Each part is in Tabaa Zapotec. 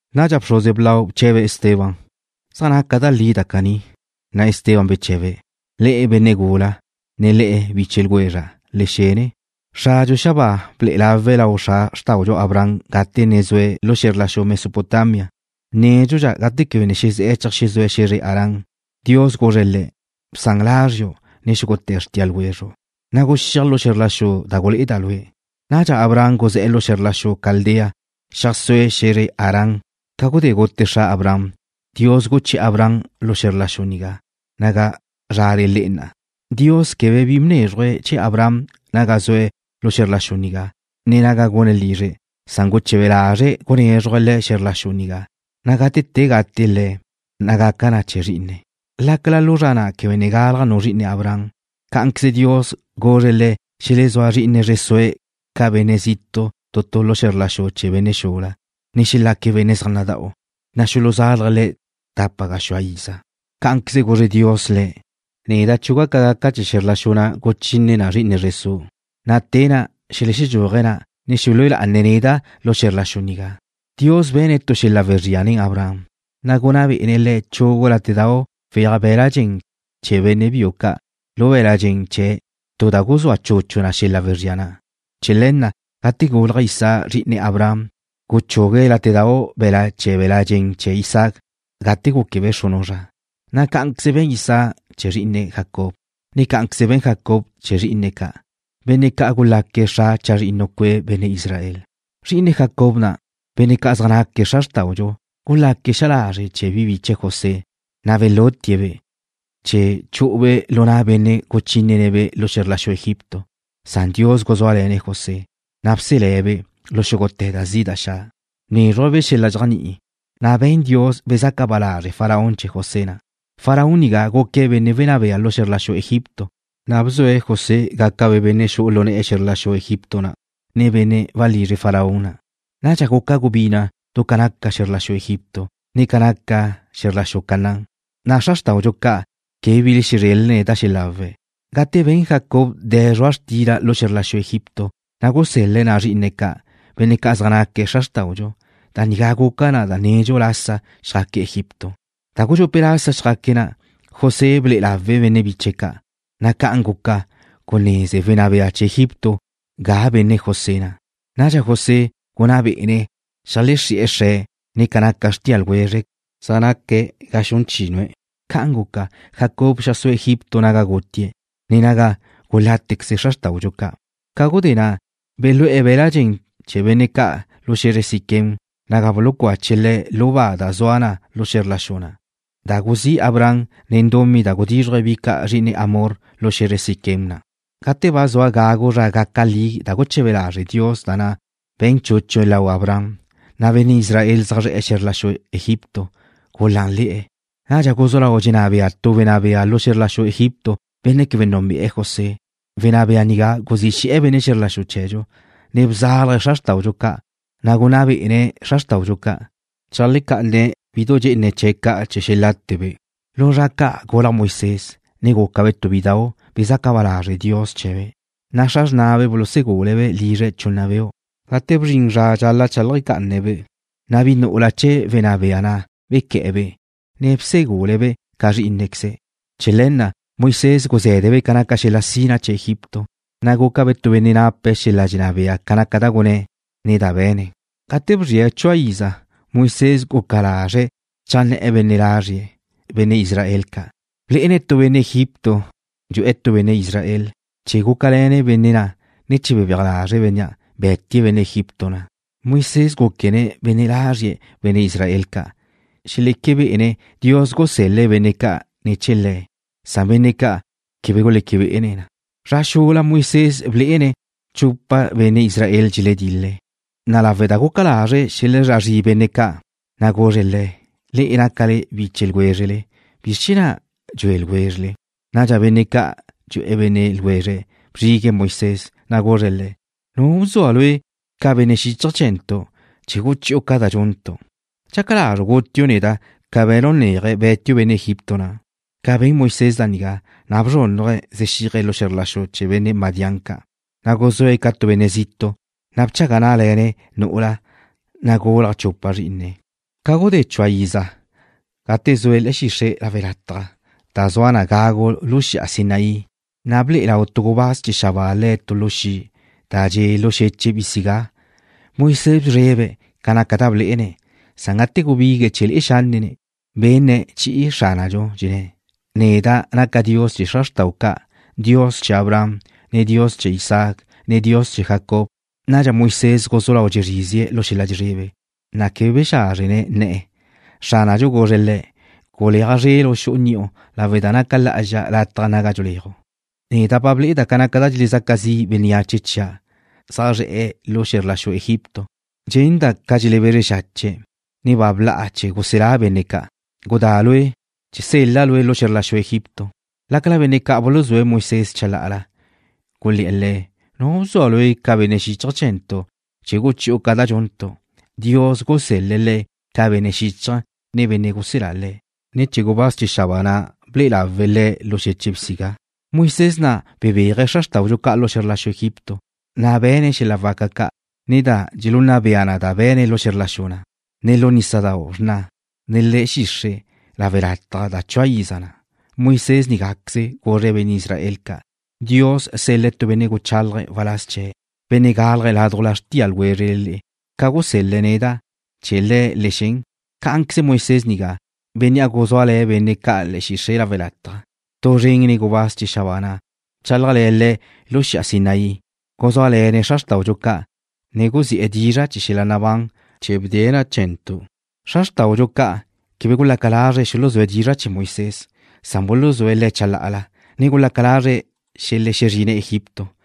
Nadxa bxruze blau bche̱be̱' Esteban: ―¿Zaj naca da li da caní? Na' Esteban beche̱be̱': ―Le'e, benne' gula, ne le'e biche ljwezra', le xene. Xradxu zue̱' xabáa ble'e lawe̱' lau xra xrtáudxu Abraham gate ne zue̱' lu xe̱zr la xu Mesopotamia, nédxudxa gate quebe ne xezé̱'e̱ cheajxezúe̱ xe̱zre Harán. Dios guzre̱' le̱': “Bsan lázriu' ne xúgute̱ xrtia ljwezru', na' guxíaj lu xe̱zr la xu da gulé'eda' lue'.” Nadxa Abraham guzé̱'e̱ lu xe̱zr la xu Caldea, xeajsúe̱' xe̱zre Harán. Ca gudé gute xra Abraham, Dios guché̱'e̱ Abraham lu xe̱zr la xu nigá, naga zrale le'e na'a. Dios quebe bi bnézruje̱' chee̱ Abraham naga sue̱' lu xe̱zr la xu nigá, ne naga gune̱' lizre̱', san guche̱be lazre̱' gunézruje̱' le̱' xe̱zr la xu nigá, na' gate te gate le̱', na' gaca na chee̱ zrí'ine̱', lácala lu zra na' quebe ne galaj nu zri'ine Abraham. Cá'anqueze Dios guzre̱' le̱' xelezúa zri'ine zre sue̱' ca benne' zitu' tu lu xe̱zr la xu chee̱ benne' xula, ne xelaque̱' benne' zaj nada'u, na' xuluzálaje̱' le̱' tapa gaxúa iza. Cá'anqueze guzre Dios le̱': “Neda' chuga' ca gaca chee̱ xe̱zr la xu na' guchine na zri'ine zre su', na' te na' xelexedxúaje̱' ga na', ne xelúe lá'ane̱' neda' lu xe̱zr la xu nigá.” Dios be̱ne̱' tu xel-la' wezría nen Abraham, na' gunná bé'ene̱' le̱' chugu látedu weaj be̱la' chee̱ benne' biu ca' lu be̱l-la' dxen chee̱', tu da guzúa chuchu na xel-la' wezría na'. Chee̱ le̱ na' gate gulaj Isaac, zri'ine Abraham, guchugue̱' látedau' be̱la' chee̱ be̱l-la' dxen chee̱ Isaac gate gúquebe' xrunu' zra, na' cá'anqueze be̱n Isaac chee̱ zrí'ine̱', Jacob, ne cá'anqueze be̱n Jacob chee̱ zrí'ine̱' ca', benne' ca' gulaque̱' xra chazrinnu cue' benne' Israel. ’Zri'ine Jacob na', benne' ca' zaj naque̱' xra xrtáudxu, gulaque̱' xa lazre' chee̱ bi biche̱' José, na' belutie̱-be' chee̱ chu'ube' lu na' benne' guchínene̱'-be' lu xe̱zr la xu Egipto. Dios guzúale̱ne̱' José, na' bselé̱'-be' lu xúgute̱ da zi' da xa'. Bnézruje̱'-be' xel-la' dxéajni'i, na' be̱n Dios bezaca ba lázrele̱ Faraón José na'. Faraón nigá guque̱' wenná bea lu xe̱zr la xu Egipto, na' bzue̱' José gácabe' benne' xu'u lu ne̱'e̱ xe̱zr la xu Egipto na', ne benne' walizre Faraón na'. ’Nadxa guca gubina' du ca naca xe̱zr la xu Egipto, ne ca naca xe̱zr la xu Canaán, na' xra xrtáudxu ca' quebe bi belezrélene̱' da xelawe̱'. Gate ben Jacob de̱ zrua' xtila lu xe̱zr la xu Egipto, na' gusel-le̱' na' zrí'ine̱' ca', benne' ca' zaj naque̱' xra xrtáudxu. Da nigá guca na da nedxu lasa xjaque̱' Egipto. Da gudxupe' lasa xjaque̱' na', José ble'e lawe̱' benne' biche̱' ca', na' ca'an guca guneze wenná bea chee̱ Egipto ga benne' José na'. Nadxa José gunná bé'ene̱' xeajlexrí'e̱ xre̱', ne ca naca xrtia ljwezre̱', zaj naque̱' ga xun chínue̱'. Ca'an guca, Jacob xeajsúe̱' Egipto naga gutie̱', ne naga gulátequeze xra xrtáudxu ca'. Ca gudé na' belú'e̱ be̱l-la' dxen gate chee̱ benne' ca' lu xe̱zre Siquem, naga bulucache̱' le̱' lu ba da zua na lu xe̱zr la xu na' da guzí' Abraham nen dumí da gudízruje̱' bi ca' zri'ine Hamor lu xe̱zre Siquem na'. ’Gate ba zua gagu zra gaca li da guche̱be lazre' Dios da na' be̱n chúchue̱' lau Abraham, na' benne' Israel zaj zre̱'e̱ xe̱zr la xu Egipto gulánle̱'e̱. Nadxa guzú lau dxenná bea tu wenná bea lu xe̱zr la xu Egipto, benne' quebe núnbe'e̱ José. Wenná bea nigá guzí xe̱'e̱ benne' ljwézredxu, ne bzálaje̱' xra xrtáudxu ca', na' gunná bé'ene̱' le̱' cheajlecá'ane̱'-be' bidu dxe'ene chee̱' ca' chee̱ xelátebe'. Lu zra ca' gulaj Moisés, ne gúcabe' tu bidau' bezaca ba lazre' Dios chee̱be', na' xra xrnabe' bulusegule̱'-be' lizre̱' chunna beu'. Gate bzrin zra zxal-la' cheajlega'ane̱'-be', na' bi nu'ula chee̱ wenná bea na' bequé̱'e̱-be', ne bsegule̱'-be' ca zrí'inequeze̱'. Chee̱ le̱ na', Moisés guzé̱debe' ca naca xel-la' sina chee̱ Egipto, na' gúcabe' tu benne' nape̱' xel-la' dxenná bea ca naca da gunné̱', ne da be̱ne̱'. ’Gate bzrie̱' chua iza, Moisés guca lazre̱' cheajnné̱'e̱ benne' ljwezre̱', benne' Israel ca'. Blé'ene̱' tu benne' Egipto dxu'e̱ tu benne' Israel. Chee̱ gúcale̱ne̱' benne' na', ne chee̱ bebéaj lazre̱' bénnea', be̱tie̱' benne' Egipto na'. Moisés gúquene̱' benne' lazrie̱', benne' Israel ca', xeleque bé'ene̱' Dios guselé̱' benne' ca' ne̱ chee̱ le̱'. Benne' ca' quebe guleque bé'ene̱' na. Zra xula Moisés blé'ene̱' chupa benne' Israel dxeledil-le̱', na' lawe' da guca lazre̱' xelezrá zrie̱' benne' ca', na' guzre̱' le̱': “Le'e nácale biche ljwézrele. ¿Bizr chee̱ na' dxue ljwézrele?” Nadxa benne' na' dxu'e̱ benne' ljwezre̱' bzrigue̱' Moisés, na' guzre̱' le̱': “¿Nu bzua lue' ca benne' xíchaje̱ chee̱ntu' chee̱ guchi'u ca da dxuntu'? ¿Dxaca lazru' gutiu' neda' ca be̱nu' neaje, be̱tiu' benne' Egipto na'?” Ca ben Moisés da nigá, na' bzrúnnaje̱' zexíaje̱' lu xe̱zr la xu chee̱ benne' Madián ca'. Na' guzúe̱' ca tu benne' zitu', na' bchaga ná'le̱ne̱' nu'ula, na' gulaj chupa zrí'ine̱'. ’Ca gudé chua iza, gate zue̱' le̱'e̱ xixre' lawe' lataj da zua na gagu lu xi'a Sinaí, na' ble'e lau tu gubáz chee̱ xabáa le̱' tu lu xi' da dxe' lu xeche' bisigá. Moisés bzrebe̱' ca naca da blé'ene̱', san gate gubigue̱' chee̱ le'e xánnene̱', benne̱' chi'i Xránadxu, dxenné̱': “Neda' naca' Dios chee̱ xra xrta'u ca', Dios chee̱ Abraham, ne Dios chee̱ Isaac, ne Dios chee̱ Jacob.” Nadxa Moisés guzú lau dxezrízie̱' lu xel-la' dxezrebe, na' quebe bexázrjene̱' nne̱'e̱. Xránadxu guzre̱' le̱': “Guleaj zrelu' xu'u ni'u lawe' da naca lá'azxa lataj naga dxeléaju'. Neda' ba ble'eda' ca naca da dxelezaca zi' bénneache chia' zaj zre̱'e̱ lu xe̱zr la xu Egipto. Dxenda' ca dxelebezre xache̱', ne ba bla'a chee̱ guselá' benne' ca'. Gudá lue', sel-la' lue' lu xe̱zr la xu Egipto.” ’Lácala benne' ca' buluzúe̱' Moisés chalá'ala, gulé̱'e̱ le̱': “¿Nu bzua lue' ca benne' xíchaje̱ chee̱ntu' chee̱ guchi'u ca da dxuntu'?” Dios gusel-le̱' le̱' ca benne' xíchaje̱, ne benne' guselá le̱', ne̱ chee̱ gubáz chee̱ xabáa na' ble'e lawe̱' le̱' lu xeche' bisigá. Moisés na' bebéaje̱' xra xrtáudxu ca' lu xe̱zr la xu Egipto, ne be̱ne̱' xel-la' waca ca', ne da gulunna bea na da be̱ne̱' lu xe̱zr la xu na', ne lu nísadau' Xrna, ne le̱'e̱ xixre' lawe' lataj da chua iza na'. Moisés nigáqueze guzre̱' benne' Israel ca': “Dios sel-le̱' tu benne' guchálaje̱' waláz chee̱', benne' gálaje̱' ládujla xrtia ljwézrele le'e, ca gusel-le̱' neda'. Chee̱ Le̱' le xen.” Cá'anqueze Moisés nigá, bénnea' guzúale̱ benne' ca' le̱'e̱ xixre' lawe' lataj, tu zren nen gubáz chee̱ xabáa na' bchálajle̱ le̱' lu xi'a Sinaí, guzúale̱ne̱' xra xrtáudxu ca', ne guzi'e̱ dizra' chee̱ xel-la' nabán chee̱ bdee̱' na chee̱ntu'. ’Xra xrtáudxu ca' quebe gulaca lazre̱' xuluzúa dizra' chee̱ Moisés, san buluzúe̱' le̱' chalá'ala, ne gulaca lazre̱' xelexezrine̱' Egipto.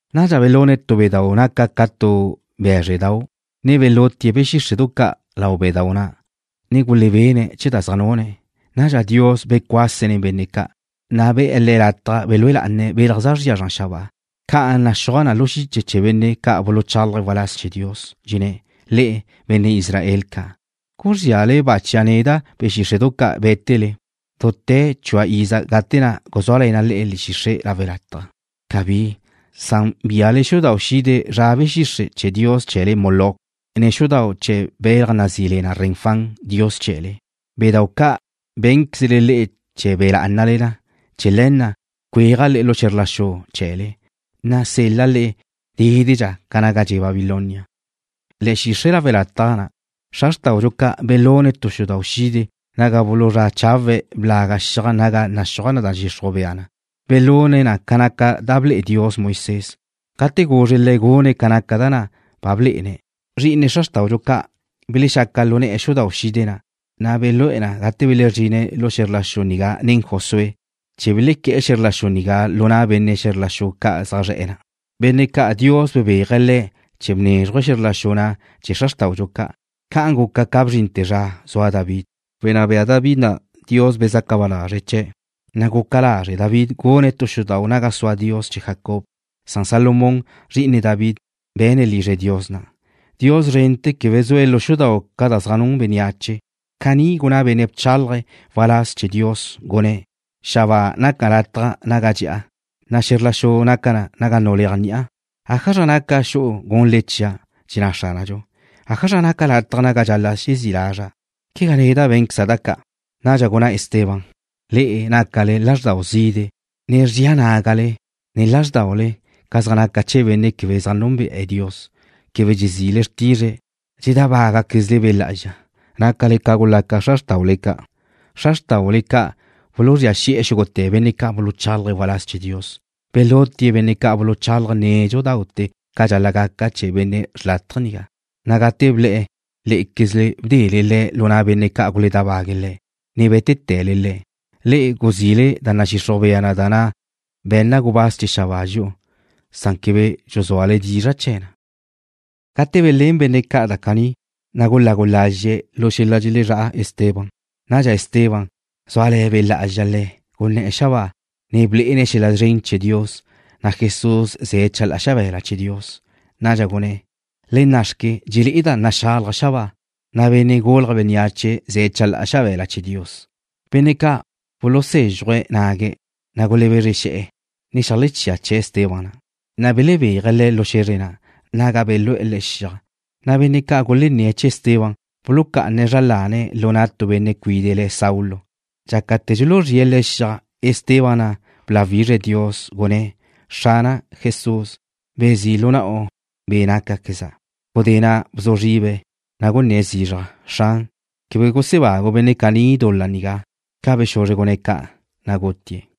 Nadxa belune̱' tu bedáu' guca na ca tu bé̱zredau', ne belutie̱' be̱ xíxre'du ca' lau bedáu' na', ne gulebene̱' chee̱ da zaj nune̱'. Nadxa Dios becuase̱' nen benne' ca', na' be̱'e̱ le̱' lataj belúe lá'ane̱' belaj zaj zria zran xabáa. Ca'an naxúaj na lu xiche chee̱ benne' ca' buluchálaje̱' waláz chee̱ Dios. Dxelenné̱': Le'e, benne' Israel ca', ¿guzríale-ba' chia' neda' be̱ xíxre'du ca' bé̱tele dute̱ chua iza gate na' guzúale le̱'e̱ xixre' lawe' lataj? ¡Cabí! Bíale xudau' xide zra be̱ xixre' chee̱ dios chee̱le, Moloc, ne xudau' chee̱ belaj nazí le na Renfán, dios chee̱le, bedáu' ca' bé̱nquezle le'e chee̱ be̱ lá'anale na. Chee̱ le̱ na' cuéaja' le'e lu xe̱zr la xu chee̱le, ne sel-la' le'e dédedxa ca naga dxe' Babilonia. ’Le̱'e̱ xixre' lawe' lataj na' xra xrtáudxu ca' belune̱' tu xudau' xide naga buluzrá chawe̱' blaga' xiaj naga naxúaj da nadxixruj bea na. Belune̱' na ca naca da ble'e Dios Moisés, gate guzre̱' le̱' gune̱' na ca naca da na' ba blé'ene̱'. Zri'ine xra xrtáudxu ca' belexaca lu ne̱'e̱ xudau' xide na', na' belú'e̱ na gate belezrine̱' lu xe̱zr la xu nigá nen Josué, chee̱ belequé̱'e̱ xe̱zr la xu nigá lu na' benne' xe̱zr la xu ca' zaj zre̱'e̱ nigá, benne' ca' Dios bebéaje̱' le̱' chee̱ bnézruje̱' xe̱zr la xu nigá chee̱ xra xrtáudxu ca'. Ca'an guca ca bzrinte̱ zra ca' zua David. Wenná bea David na', Dios bezaca ba lazre̱' chee̱', na' guca lazre' David gune̱' tu xudau' naga sua Dios chee̱ Jacob. Salomón, zri'ine David, be̱ne̱' lizre Dios na'. Dios szrente̱ quebe zue̱' lu xudau' ca' da zaj nun bénneache. Caní gunná tu benne' bchálaje̱' waláz chee̱ Dios, gunné̱': Xabáa naca lataj naga dxe'a, na' xe̱zr la xu naca na naga nuléaj ni'a. ¿Ájazra naca xu'u gunle le'e chia'? dxenná Xránadxu. ¿Ájazra naca lataj naga dxal-la' xezí' lazra'? ¿Quegá neda' bé̱nqueza' da ca'? Nadxa gunná Esteban: ―Le'e nácaquezle lázxdau zide', ne zria nágale, ne lázrdaule ca zaj naca chee̱ benne' quebe zaj núnbe'e̱ Dios, quebe dxezile xrtizre̱'. Dxedábagaquezle Be' Lá'azxa. Nácale ca gulaca xra xrtáule ca'. Xra xrtáule ca' buluzría xi'e̱ xúgute̱ benne' ca' buluchálaje̱' waláz chee̱ Dios. Belutie̱' benne' ca' buluchálaje̱' nédxudaute̱ ca dxal-la' gaca chee̱ benne' xrlátaje nigá, na' gate ble̱'e̱, lé'equezle bdele Le̱' lu na' benne' ca' guledábague̱' Le̱', ne bé̱tele Le̱'. Le'e guzile da nadxixruj bea na da be̱nna gubáz chee̱ xabáa dxi'u, san quebe dxuzúale dizra' chee̱ na. Gate belén benne' ca' da caní, na' gulagu lazxe̱' lu xel-la' dxelezrá'a Esteban. Nadxa Esteban, zúale̱ Be' Lá'azxa le̱', gunné̱'e̱ xabáa, ne blé'ene̱' xel-la' szren chee̱ Dios, na' Jesús ze̱' chalá'a xabe̱la chee̱ Dios. Nadxa gunné̱': ―Le nna'xque, dxelé'eda' naxalaj xabáa, na' Benne' Gulje̱' Bénneache ze̱' chalá'a xabe̱la chee̱ Dios. Benne' ca' bulusézxuje̱' nague̱', na' gulebezre xe̱'e̱, ne xeajlechía che̱'e̱ Esteban na'. Na' belebéaje̱' le̱' lu xe̱zre na', naga belú'e̱ le̱' xiaj. Na' benne' ca' gulenné̱' chee̱ Esteban bulucá'ane̱' zra lane̱' lu na' tu benne' cuide' le̱' Saulo. Dxácate̱ dxuluzríe̱' le̱' xiaj, Esteban na' bláwizre̱' Dios, gunné̱': ―Xrana' Jesús, bezí' lu na'u be' nácaqueza'. Gudé na' bzu zribe̱', na' gunné̱' zizraj: ―Xran, quebe gusebagu' benne' caní dul-la nigá. Ca bexuzre gunné̱' ca', na' gutie̱'.